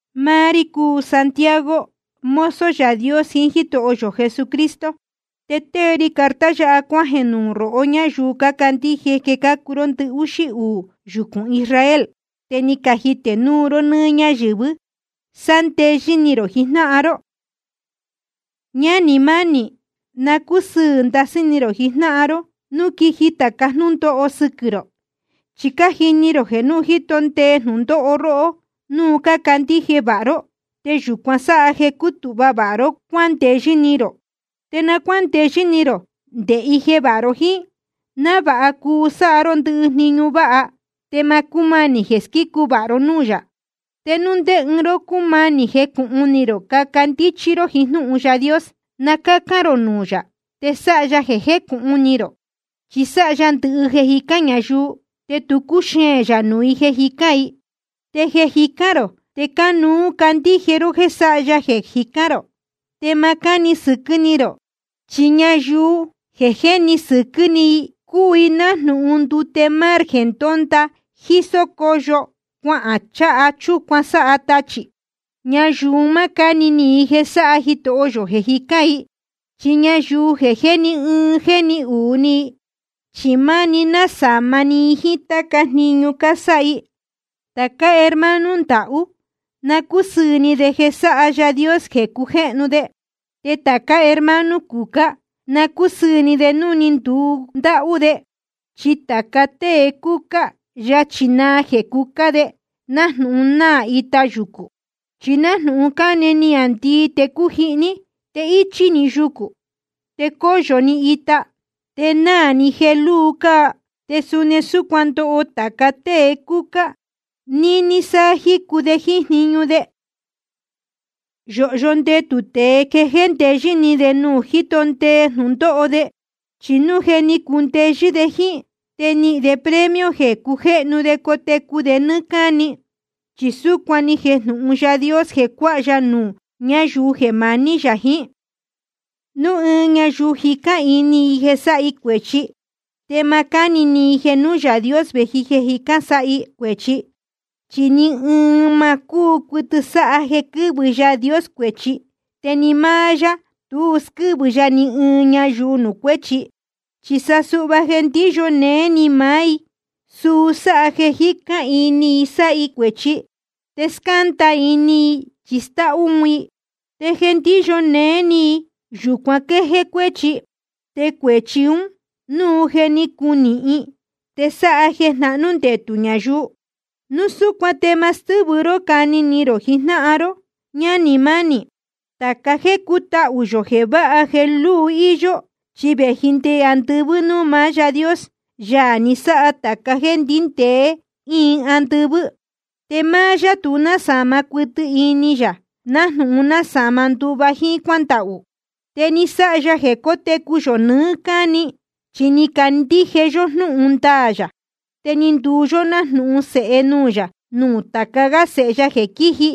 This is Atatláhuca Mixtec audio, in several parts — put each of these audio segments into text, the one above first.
Máá rí cúu Santiago, mozo Yaā Dios jiín Jítoho yō Jesucristo. Te tée ri carta yáha cuájeē nuū rohó ñáyuu cácandíje jeē cácuu ró ndɨhúxí uū yucūn Israel, te ni cajitē núu ró nɨ́ɨ́ ñáyɨ̄vɨ́. Sándeyɨ́ ni rō jijnáhan ró. Ñánī mánī, na cúsɨɨ̄ ndasɨ́ ni rō jijnáhan ró núu quiji tɨjnɨ tāca jnúndóho sɨquɨ̄ rō. Chi cájini rō jeē núu jíto ndee jnūndóho róhó núu cácandíje vāha ró, te yūcuan sáha jeē cútūhva ró cuándeyɨ́ ni rō. Te na cuándeyɨ́ ni rō nde ije vāha ró jíín, návāha cuu sáha ró ndɨhɨ jniñu váha, te ma cúmanī jeē squícu vāha ró núū yā. Te núu ndé ɨɨn ró cúmanī jecūhun ni rō caca ndíchí ró jiín jnúhun Yaā Dios, na cácán rō nuū yā, te sáha ya jeē jécūhun ni rō. Chi sáha ya ndɨhɨ jeē cájicān ñayuu, te tu cúxeēn yā nuū i jeē jicán i. Te jeē jicán rō, te cánuú candíje ró jéē sáha ya jeē jicán rō, te ma cáni sɨquɨ́ ni rō. Chi ñayuu jéni sɨquɨ́ ni, cúu i nájnūhun ndute mar jeē ndónda jísó cóyo cuahān cháha chúcuan sáha tachī. Ñayuu ún ma cáni ni i jeē sáha Jitoho yō jeē jicán i. Chi ñayuu jeē jéni ɨɨn jéni uū ni, chi máni násāma ni i jíín táca jniñu cásáha i. Tācá hermano ndahú, na cúsɨɨ̄ ni de jeē sáha Yaā Dios jeē cujéhnu de. Te hermano cucá, na cúsɨɨ̄ ni de núu ni ndundáhú de. Chi tāca tée cúcá, yachī naa jeē cucá de, nájnūhun náā ita yucū. Chi núu ni cane niāndii te cújihní, te íchí‑ni yucū, te cóyo‑ni ita, te náā‑ni jeē lúu cáa. Te suni súcuan ndoho tāca tée cúcá níní sá jícu de jíín jniñu de. Yōhyo ndetū tēe jeē jéndeyɨ́ ni de núu jíto ndee jnūndóho de. Chi núu je ni cundeyɨ́ de jíín, te nihīn de premio jeē cujéhnu de cotecu de nɨ́ɨ́ cáni. Chi súcuan ni jejnūhun Yaā Dios jeē cuáha ya nuū ñáyuu jeē maní jiín yá. Núu ɨɨn ñayuu jicán ini i jeē sáha i cuēchi, te ma cáni ni i jeē nuū Yaā Dios vēji jeē jicán sáha i cuēchi. Chi ni ɨɨn ma cúu cuɨtɨ sáha jeē quɨ́vɨ Yaā Dios cuēchi, te ni máá yá tu squɨ́vɨ ya ni ɨɨn ñayuu nuū cuéchi. Chi sa suhva jeē ndíyo néé ni maá i, suu sáha jeē jicán ini i sáha i cuēchi, te scánda ini i chi stáhú un i. Te jeē ndíyo néé ni i, yūcuan quéjéé cuéchi. Te cuēchi ún, núu je ni cunīhin, te sáha jeē jnahnú ndetū ñayuu. Núu súcuan te ma stɨ́vɨ ró cani ni rō jijnáhan ró, ñánī mánī. Tāca jéē cútahū yō jeē váha jeē lúu íyó, chi vēji nde andɨvɨ́ núū maá Yaā Dios, Yaā ni sáha tāca jéē ndíndēe íin andɨvɨ́. Te máá yá tu násāma cuɨtɨ ini yā nájnūhun násāma nduva jíín cuándahū. Te ni sáha ya jeē cótecu yō nɨɨ́ cáni, chi ni candíje yó jnúhun ndaā yā. Te ni nduu yó nájnūhun sēhe nuú yá nuū tāca gá sēhe ya jeē quíji,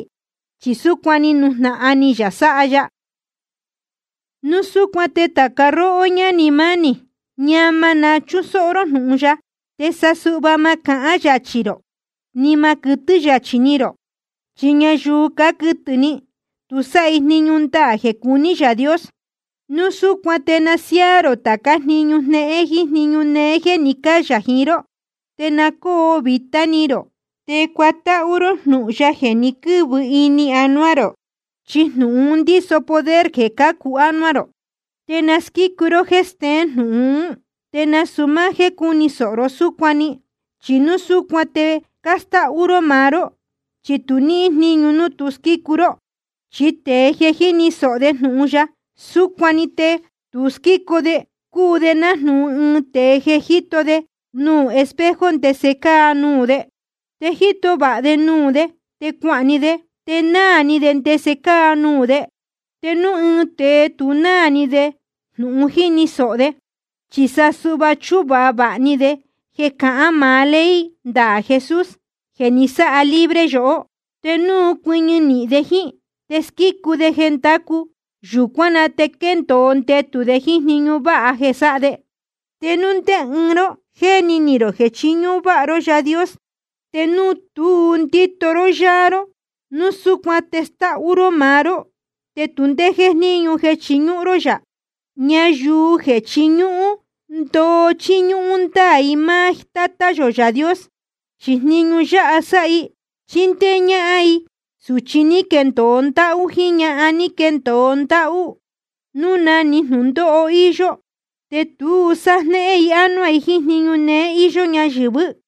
chi súcuan ni nujnahan ni yā sáha ya. Núu súcuan te tāca róhó ñánī mánī, ñama na chúsóhó ró jnūhun ya, te sa suhva ma cahán yachī rō, ni ma quɨtɨ́ yachī ni rō. Chi ñayuu cáquɨtɨ̄ ni, tu sáha i jniñu ndaā jeē cuní Yaā Dios. Núu súcuan te na siáá rō tācá jniñu jnéhén jíín jniñu néé jéē ni cáyā jiín ró. Te na cóo vītá ni rō te cuatáhú ró jnūhun ya jeē ni quɨ́vɨ ini anuá rō. Chi jnūhun un ndíso poder jeē cācu ánuá rō. Te na squícu ró jéē steén jnūhun ún, te nasūu máá jéē cúni sōho ró súcuan‑ni, chi núu súcuan te cástáhú ró maá ró, chi tu níhín jníñu núu tu squícu ró. Chi tēe jeē jíni sōho de jnūhun ya súcuan‑ni, te tu squícu de, cúu de nájnūhun ɨɨn tēe jeē jíto de nuū espejo ndese cáa nuū de. Te jíto vāha de nuū de, te cuahān‑ni de, te náā ni de ndese cáa nuū de. Te núu ɨɨn tēe tu náā ni de jnūhun jíni sōho de, chi sa suhva chúhun vāha ni de jeē cahán maá ley ndaā Jesús jeē ni sáha libre yohó, te núu cuɨñɨ nīhin de jíín, te squícu de jeē ndácu, yūcuán na te quéndōo ndetū de jíín jniñu váha jeē sáha de. Te núu ndé ɨɨn ró jéni ni rō jeē chiñúhún váha ró Yaā Dios, te núu tu ndíto ró yáá ró, núu súcuan te stáhú ró maá ró, te tu ndé jéjníñu jeē chiñúhún ró yā. Ñayuu jeē chiñúhún ndoo chíñúhún ndáā i máá Tátá yō Yaā Dios, chi jniñu yáha sáha i: Chíndéé ñáhán i sūchi ní caquendōo ndáhú jíín ñahan ní caquendōo ndáhú, núu na‑ni jnūndóho íyó. Te tu sájnéhén i ánuá i jíín jniñu néé íyó ñáyɨ̄vɨ́.